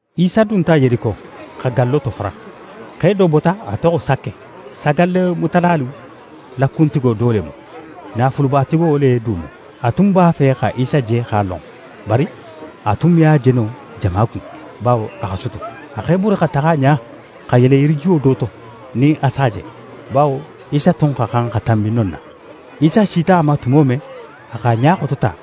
Isa dunta Yeriko, xa gallo tofara. Xe do bota, a toxo Sake; sagallemutalalu la kuntigo do le mu, naafulubatigo le du mu. A tun b'a fe xa Isa je x'a lon, bari a tun me a je no jama kun, bawo a xa sutu. A x'é bori xa taxa ɲa, xa yele yirijuwo do to, nin a s'a je, bawo Isa tun xa xan xa tanbi non na. Isa sita a ma tumo men, a x'a ɲa xotota,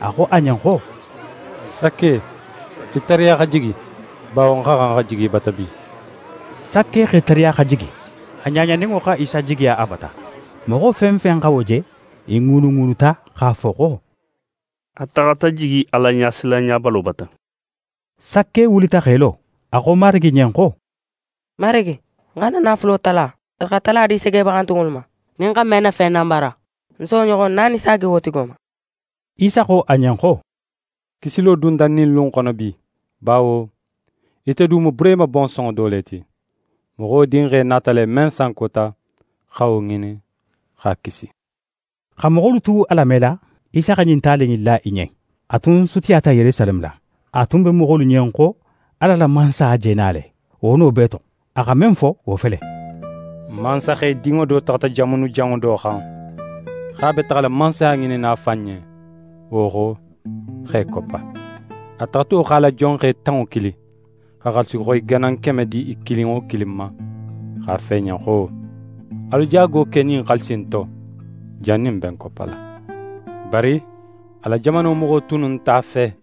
a xo a ɲen xo: «Sake, í tariya xa jigi, bawo ń xa xan xa jigi í bata bi.» Sake x'é tariya xa jigi. A ɲaɲaninŋo xa Isa jigiya a bata. Moxo fen fen xa wo je, i ŋuunuŋuunuta x'a fo xo: «A taxata jigi Alaɲasilanɲabalo bata.» Sake wulita x'é lo, a xo Marigi ɲen xo: «Marigi, ń xa ń na naafulo tala, x'a tala di segebaxantunŋolu ma. Nin ń xa men na fen nanbara, ń si wo ɲoxon naani saagi wo tigo ma.» Isa xo a ɲen xo: «Kisilo dunta ɲin lu in xono bi, bawo ite du mu Burehima bonsonŋo do le ti. Moxo Dinxe nata le, men sankota, xa wo ŋinin, x'a kisi.» Xa moxolu tu a lamela, Isa xa ɲin tali in la i ɲen. A tun sutiyata Yerusaleme la, a tun be moxolu ɲen xo Ala la Mansaya je na le, wo no bee to. A xa men fo, wo fele: «Mansaxedinŋo do taxata jamanujanŋo do xan, x'a be taxala mansaya ŋininna a fan ɲen, wo xo, x'é koppa. A taxato x'a la jonxe tanŋo kili, xa xaalisixoyi ganan keme di i kilin wo kilin ma, x'a fo i ɲen xo: “Alu jaago ke ɲin xaalisi in to, jannin ń be ń koppala.” Bari a la jamano moxo tunnu nte a fe;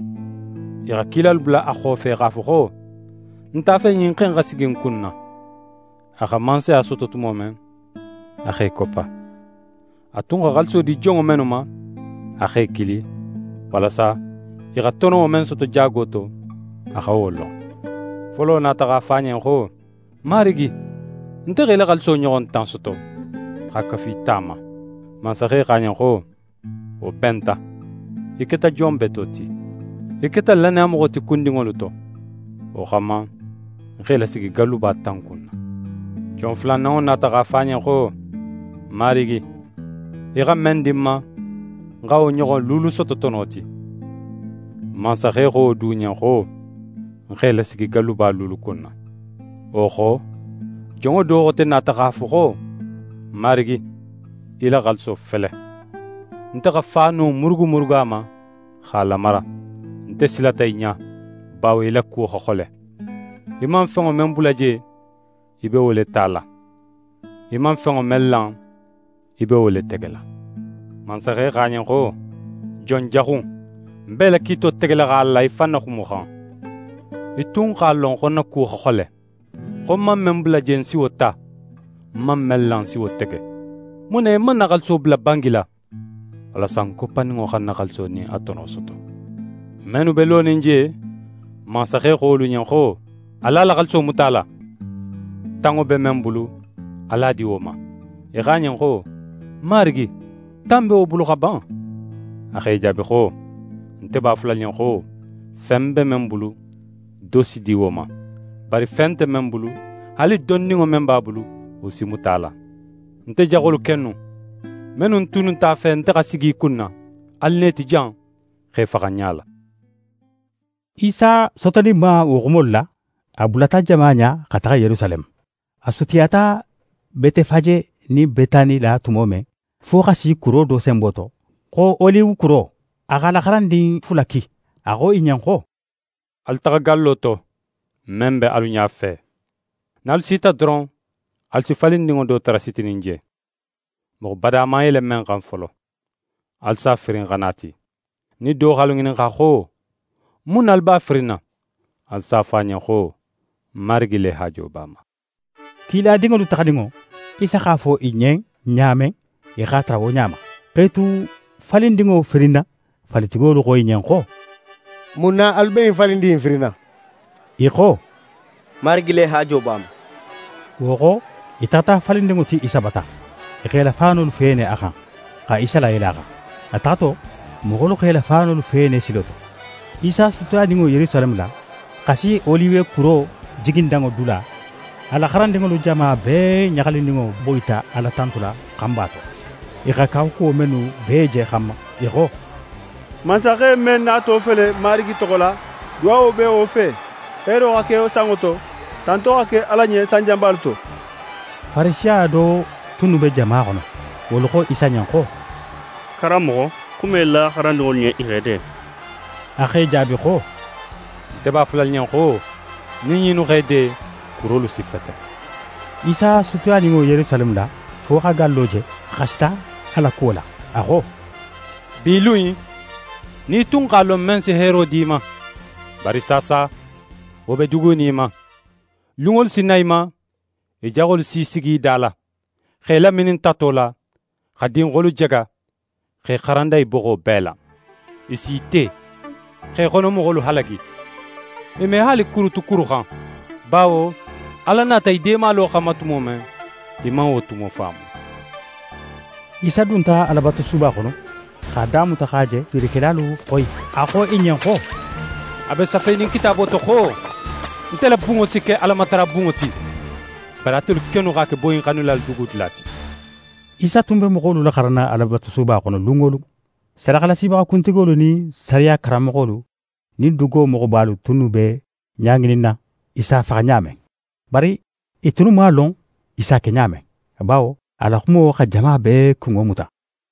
i xa kilalu bula a xofe x'a fo xo: “N nte a fe ɲin xe in xa sigi n kunna.” A xa mansaya soto tumo men, a x'é koppa. A tun xa xaaliso di jonŋo mennu ma, a x'e kili, walasa i xa tono men soto jaago to, a xa wo lon. Folo nata x'a fo a ɲen xo: “Marigi, nte xa í la xaaliso ɲoxon tan soto, x'a kafu í ta ma.” Mansaxe xo a ɲen xo: “Wo benta, í keta jon beto ti. Í keta lannayamoxo ti kundinŋolu to. Wo xanma, ń x'é lasigi galluba tan kunna.” Jon fulananŋo nata x'a fo a ɲen xo: “Marigi, í xa men di ń ma, ń x'a ɲoxon luulu soto tono ti.” Mansaxe xo wo du ɲen xo: “Ń x'é lasigi galluba luulu kunna.” Wo xo, jonŋo do xote nata x'a fo xo: “Marigi, í la xaaliso fele; nte xa faano murugumurugu a ma, x'a lamara. Nte silata í ɲa, bawo í la kuwo xa xole. Í man fenŋo men bula je, í be wo le tala, í man fenŋo men lan, í be wo le tegela.” Mansaxe xo a ɲen xo: “Jon jaxu in! Ń b'é la kiito tegela x'a la í fan na xumo xan. Í tun x'a lon xo ń na kuwo xa xole; xo ń man men bula je, ń si wo ta, ń man men lan, ń si wo tege. Mun na í man ń na xaaliso bula bangi la, walasa ń koppaninŋo xa ń na xaaliso nin a tono soto?” Mennu be lonin je, mansaxe xo wolu ɲen xo: “Alu a la xaaliso muta a la. Tanŋo be men bulu, alu a di wo ma.” I xo a ɲen xo: “Marigi, tan be wo bulu xa ban!” A x'e jaabi xo: “Nte b'a fola alu ɲen xo, fen be men bulu, do si di wo ma; bari fen nte men bulu, haali dondinŋo men b'a bulu, wo si muta a la. Nte jaxolu kennu, mennu tunnu nte a fe nte xa sigi i kunna, alu na i ti jan, x'e faxa ń ɲala.”» Isa sotoninma wo xumolu la, a bulata jama ɲa xa taxa Yerusaleme. A sutiyata Betefaje nin Betani la tumo men, fo xa si kuro do senbo to, xo Oliwe kuro, a x'a la xarandin fula ki. A xo i ɲen xo: «Alu taxa gallo to, men be alu ɲafe. Nin alu sita doron, alu si falindinŋo do tara sitinin je, moxo bada man yele men xan folo. Alu si a firin xa na a ti. Nin do x'alu ŋininxa xo: “Mun na alu b'a firinna?” Alu s'a fo a ɲen xo: “Marigi le haajo b'a ma.”» Kiladinŋolu taxaninŋo, Isa x'a fo i ɲen ɲa men, i x'a tara wo ɲa ma. X'e tu falindinŋo firinna, falitigolu xo i ɲen xo: «Mun na alu be ɲin falindin in firinna?» I xo: «Marigi le haajo b'a ma.» Wo xo, i taxata falindinŋo ti Isa bata. I x'e la faanolu feene a xan, xa Isa layele a xan. A taxato, moxolu x'e la faanolu feene silo to. Isa sutiyaninŋo Yerusaleme la, xa si Oliwe kuro jigindanŋo dula, a la xarandinŋolu jama bee ɲaxalininŋo boyita Ala tantula xanba to, i xa kawakuwo mennu bee je xanma. I xo: «Mansaxe men nato fele Marigi toxo la, duwawo be wo fe! Heero xa ke sanŋo to, tanto xa ke Ala ɲen sanjanbalu to!» Farisiya do tunnu be jama xono, wolu xo Isa ɲen xo: «Karanmoxo, xuma í la xarandinŋolu ɲen i x'e de.» A x'e jaabi xo: «Nte b'a fola alu ɲen xo, nin ɲinnu x'e de, kurolu si feten!» Isa sutiyaninŋo Yerusaleme la fo x'a gallo je, a xasita a la kuwo la. A xo: «Bi lun in, nin í tun x'a lon men si heero di í ma! Bari saasa, wo be dugunin í ma. Lunŋolu si na í ma, í jaxolu si sigi í da la, x'é laminin tato la, xa dinxolu jaga, x'é xaranda í boxo bee la. I s'í te, x'é xono moxolu halagi. I me haali kuru tu kuru xan, bawo Ala nata í deemalo xanma tumo men, í man wo tumo faamu.» Isa dunta Alabatusuba xono, x'a damuta xa je fiirikelalu xoyi. A xo i ɲen xo: «A be safenin Kitaabo to xo: “Nte la bunŋo si ke Alamatarabunŋo ti.” Bari atelu kennu x'a ke boyinxannilalu dugudula ti.» Isa tun be moxolu laxaranna Alabatusuba xono lun wo lun. Sadaxalasibaxa kuntigolu nin sariya karanmoxolu nin dugo moxobalu tunnu be ɲa ŋininna, i s'a faxa ɲa men. Bari i tunnu man a lon i s'a ke ɲa men, bawo a la xumo xa jama bee kunŋo muta.